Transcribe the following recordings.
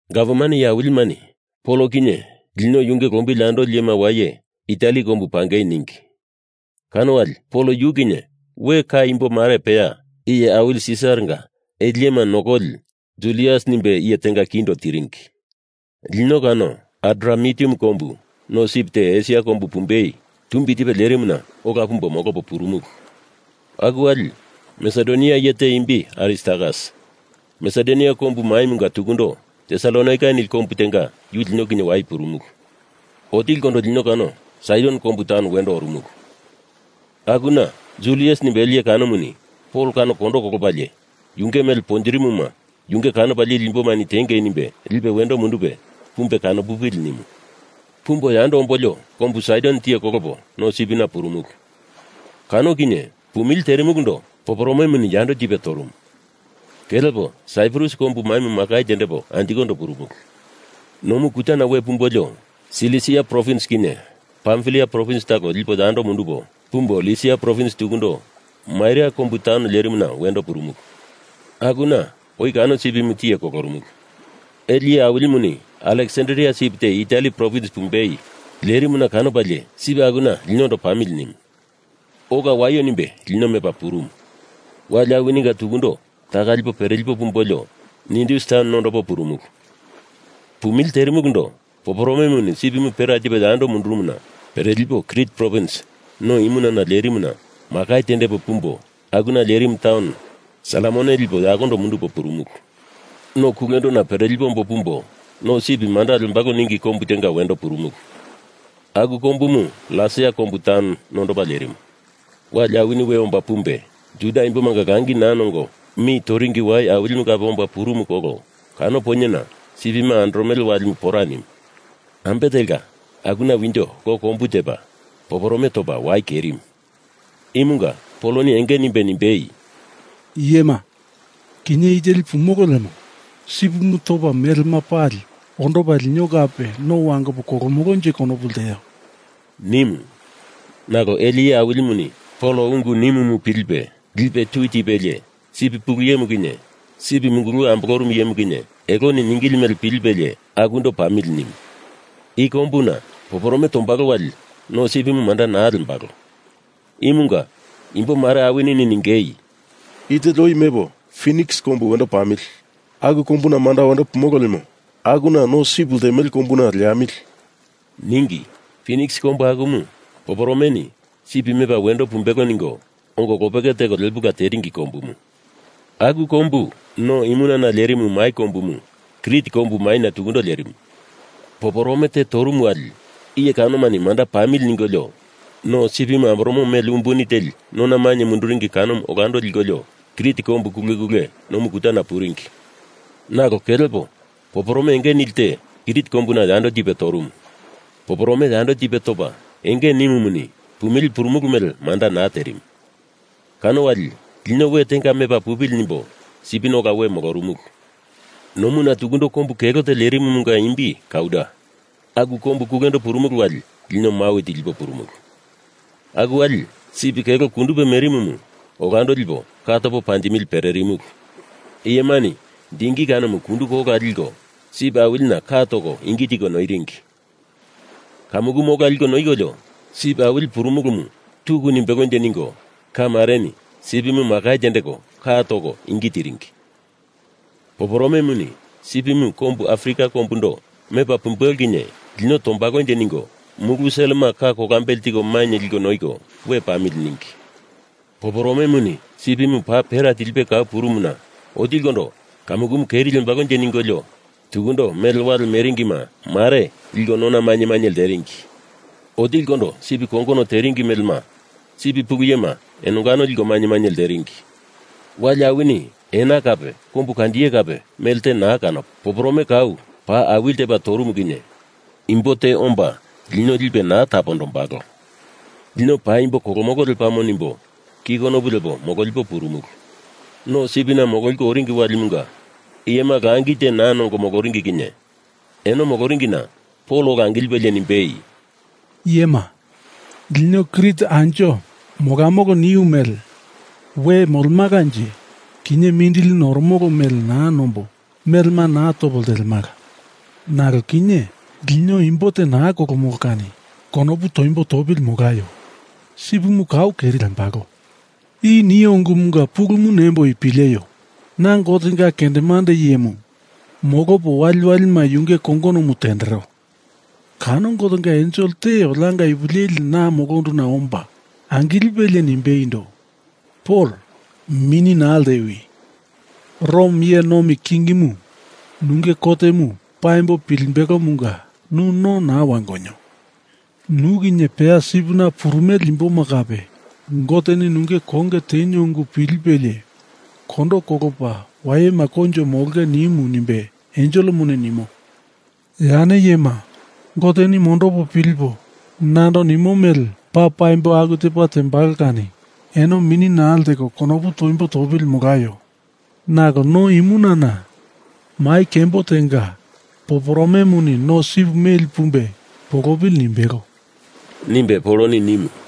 Gavman iye awilimani Pol kinye lino yunge lombili andoli iyema waye Itali kombu pangei ningi. Kano wali Pol yu kinye we ka imbo mare peya iye awili Sisaranga ele iyema nokoli Julius nimbe iye tenga kindo tiringi. Lino kano Adramitium kombu no sip te Esia kombu pumbei tumbi tipe lerimuna ola pumbo molopo purumulu. Aku wali Masedonia iye te imbi Aristarkas Masedonia kombu maimunga tukundo Tesalonaika nili kombu tenga yu lino kinye waye purumulu. Otilikondo lino kano Saidon kombu taun wendo orumulu. Akuna Julius nimbe ele iye kanomuni Pol kano kondo kolopalie yu mele pontirimoma yunge kanopa lili imbomani tiengei nimbe lipe wendo mundupe, pumbe kano pupili nimu. Pumbo yando ombolio kombu Saidon tiye kolopo no sipina purumulu. Kano kinye pumili terimulundo poporomemuni yando tipe torumu. Kelepo Saiprus kombu maimu makai tendepo anjikondo purumulu. Nomu kutana we pumbolio Silisia provins kinye Pamfilia provins talo lipo yakondo mundupo pumbo Lisia provins tukundo Maira kombu taun lerimuna wendo purumulu. Akuna oi kano sipimu tiye kolorumulu. Ele iye awilimuni Aleksandria sip te Itali provins pumbei lerimuna kanopalie sip akuna linondo pamili nimu. Ola waio nimbe lipe meli purumu. Wali awininga tukundo taka lipo perelipo pumbolio Nidus taun nondopo purumulu. Pumili terimulundo poporomemuni sipimu pera tipe yando mundurumuna perepolio Krit provins no imunana lerimuna makai tendepo pumbo akuna lerimu taun Salmone lipo yakondo mundupo purumulu. Nomu kulendona perelipo ombo pumbo No Sip Manda Lembalo ningi kombu tenga wendo purumulu. Aku kombumu Lasea kombu taun nondopa lerimu. Wali awini we omba pumbe Juda imbomanga Langi naa nongo mi toringi wai awilimu kape omba purumu kolo kano poinyena sipima andoromele walimu pora nimu. Ambe telka akuna winjo lo kombu tepa poporome topa wai kerimu. Imunga Poloni enge nimbe nimbei, “Iyema, kinye i teli pumolo lemo sipimu topa melema pali ondopa lino kape no wangopo kolomolonje konopu lteo,” nimu. Nalo ele iye awilimuni Pol ungu nimumu pilipe lipe tu tipelie sip pulu iyemu kinye sip munguluwe ambolorumu iyemu kinye eloni ningili mele pilipelie akundo pamili nimu. I kombuna poporome tombalo wali no sipimu manda naa lembalo. Imunga imbo mare awini ningei, “I teli oi mepo Finiks kombu wendo pamili. Aku kombu manda wendo pumolo lemo akuna no sipimu ltemele kombuna leamili,” ningi. Finiks kombu akumu, poporomeni sip mepa wendo pumbelo ningo ongo lopeke teko lepula teringi kombumu. Aku kombu no imunana lerimu mai kombumu Krit kombu maina tukundo lerimu. Poporome te torumu wali iye kanoma manda pamili ningolio no sipimu amboromo mele umbuni teli nona mainye munduringi kanomu olando likolio Krit kombu kule kule nomu kutana puringi. Nalo kelkepo poporome enge nili te Krit kombuna yando tipe torumu. Poporome yando tipe topa enge nimumuni pumili purumulu mele manda naa terimu. Kano wali lino we tenga mepa pupili nimbo sipina ola we molorumulu. Nomuna tukundo kombu kelo te lerimumunga imbi Kauda. Aku kombu kulendo purumulu wali lino mawi tilipo purumulu. Aku wali sip kelo kundupe merimumu olando lipo ka topo panjemili pererumulu. Iyemani dingi kanomu kunduko ola liko sip awilina ka toko ingi tiko noiringi. Kamukumu ola liko noikolio sip awili purumulumu tuku nimbelonje ningo ka mareni sipimu makai tendeko ka toko ingi tiringi. Poporomemuni sipimu kombu Afrika kombundo mepa pumbelo kinye lino tombalonje ningo mulu selema ka kolambele tiko mainye liko noiko we pamili ningi. Poporomemuni sipimu paa pera tilipe kau purumuna otilikondo kamukumu keri lembalonje ningolio, tukundo mele wale meringima mare liko nona mainye mainye lteringi. Otilikondo sip kongono teringi melema sip pulu iyema enongano liko mainye mainye lteringi. Wali awini ena kape kombu kandiye kape melte naa kanopo, “Poporome kau paa awili tepa torumu kinye, Imbo te omba lino lipe naa tapondombalo. Lino paimbo kolomolo lepamo,” nimbo ki konopu lepo mololipo purumulu. No sipina mololiko oringi walimunga iyema langi te naa nongo moloringi kinye eno moloringina Pol ola angilipelie nimbeindo, “Iyema, lino Krit anjo molamolo niu mele pilipo anjo we molemalanje, kinye mindili noromolo mele naa nombo melema naa topo ltelemala. Nalo kinye lino imbo te naa kolomolo kani konopu toimbo topili molaio. Sipimu kau keri lembalo. I nio ungumunga pulumu nemboi pileio. Na Gotenga kendemande iyemu molopo waliwalima yunge kongonomu tendero. Kano Gotenga ensel te olianga ipu leli na molonduna omba angilipelie nimbeindo, ‘Pol, mini naa ltewi. Rom iye nomi kingimu nunge kotemu paimbo pilimbelomunga nu no naa wangonio. Nu kinye peya sipina purumele imboma kape Goteni nunge konge tenio ungu pilipelie kondo kolopa wayema koinjo molonge nimu,’ nimbe enselemuni nimo. Ya ne iyema, Goteni mondopo pilipo nando nimo mele paa paimbo aku tepa tembalo kani eno mini naa lteko konopu toimbo topili molaio. Nalo no imunana mai kembo tenga poporomemuni no sip meli pumbe polopili nimbelo,” nimbe Poloni nimu.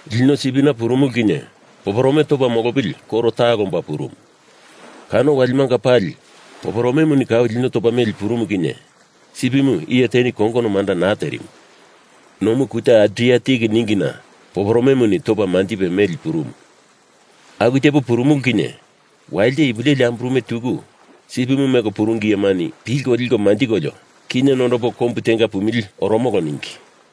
Lino sipina purumulu kinye poporome topa molopili koro talo omba purumu. Kano walimanga pali poporomemuni kau lino topa meli purumu kinye sipimu iye teni kongono manda naa terimu. Nomu Kuta Adriatik ningina poporomemuni topa manjipe meli purumu. Aku tepo purumulu kinye walite ipu leli amburume tuku sipimu meko puringi iyemani pilko liko manjikolio, kinye nondopo kombu tenga pumili oromolo ningi.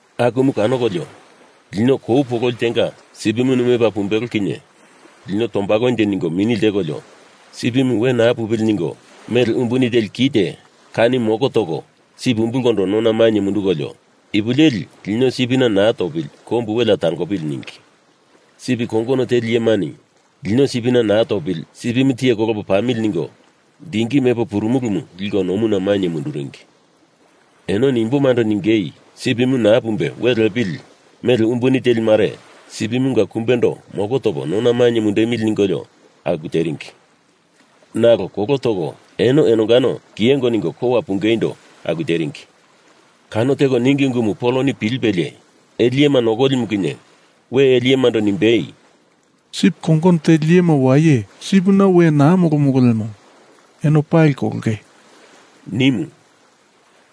Akumu kanokolio, lino kou pololi tenga sipimuni mepa pumbelo kinye lino tombalonje ningo mini ltekolio sipimu we naa pupili ningo, mele umbuni teli kite kani moko toko sip umbulkondo nona mainye mundukolio, ipu leli lino sipina naa topili kombu welea tangopili ningi. Sip kongono teli iyemani lino sipina naa topili, sipimu tiye kolopo pamili ningo dingi mepo purumulumu liko nomuna mainye munduringi. Enoni imbomando ningeindo Sipimu naa pumbe we lepili mele umbuni teli mare sipimunga kumbendo moko topo nona mainye mundemili,” ningolio aku teringi. Nalo kolo toko eno enongano kiyengo ningo kowa pungeindo aku teringi. Kano teko ningi ungumu Poloni pilipelie ele iyema nokolimu kinye we ele iyemando nimbei, “Sip kongono teli iyema waye sipina we naa molomolo lemo eno pali kolonge,” nimu.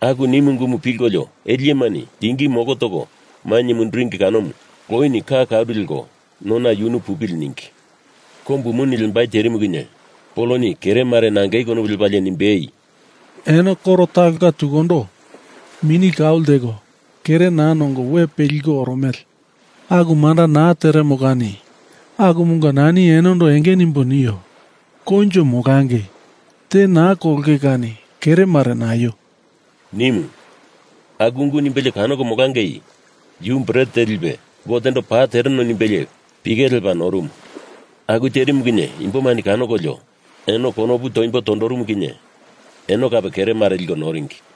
Aku nimu ungumu pilkolio ele iyemani dingi moko toko mainye munduringi kanomu loini ka karu leko nona yunu pupili ningi. Kombu muni lembai terimu kinye Poloni kere mare nangei konopu lepalie nimbei, “Eno koro talonga tukundo mini kau lteko kere naa nongo we peliko oromele. Aku manda naa teremo kani akumunga nani enondo enge nimbo nio. Koinjo molangei, te naa kolonge kani kere mare naio,” nimu. Aku ungu nimbelie kanoko molangei yu bret te lipe Gotendo paa tereno nimbelie pike lepa norumu. Aku terimu kinye imbomani kanokolio eno konopu toimbo tondorumu kinye eno kape kere mare liko noringi.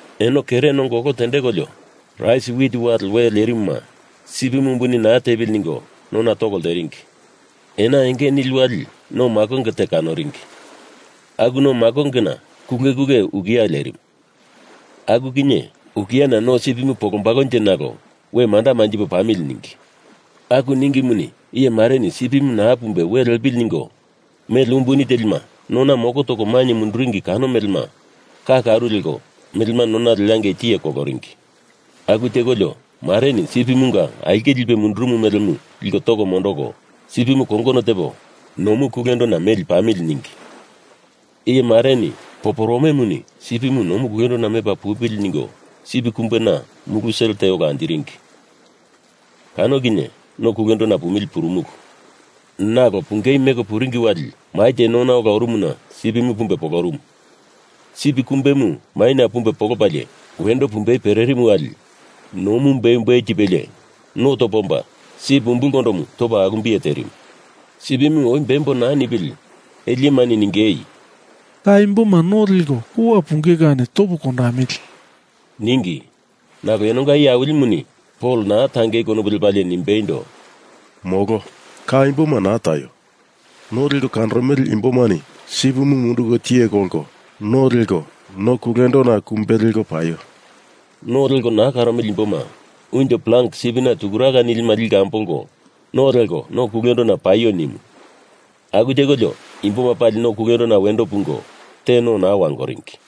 Eno kere nongo olo tendekolio rais wit wale we lerimuma sipimu umbuni naa tepili ningo nona toko lteringi. Ena enge nili wali no makonge te kanoringi. Aku no makongemunga kule kule ukia lerimu. Aku kinye ukiana no sipimu polombalonje nalo we manda manjipo pamili ningi. Aku ningimuni iye mareni sipimu naa pumbe we lepili ningo mele umbuni telima moko toko nona mainye munduringi kano melema ka karu leko melema nona leangei tiye koloringi. Aku tekolio mareni sipimunga aulke lipe mundurumu melemu liko toko mondoko sipimu kongono tepo nomu kulendona meli pamili ningi. Iye mareni poporomemuni sipimu nomu kulendona mepa pupili ningo sip kumbena mulu sel te ola anjiringi. Kano kinye no kulendona pumili purumulu. Nalo pungei meko puringi wali mai te nona ola orumuna sipimu pumbe polorumu. Sip kumbemu maina pumbe polopalie wendo pumbei pererimu wali nomu beumbeu tipelie no topa omba sip umbulkondomu topa alumbiye terimu. Sipimu oi bembo naa nipili ele iyemani ningei, “Ka imboma no leko kowa punge kani topo kondamili,” ningi. Nalo enonga iye awilimuni Pol naa tangei konopu lepalie nimbeindo, “Molo, ka imboma naa taio. No leko kanoromele imbomani sipimu munduko tiye kolko no leko no kulendona kumbe leko paio. No leko naa karomele imboma unjo plang sipina tukuraka nilima liko ambolko no leko no kulendona paio,” nimu. Aku tekolio imboma pali no kulendona wendo pungo te no naa wangoringi.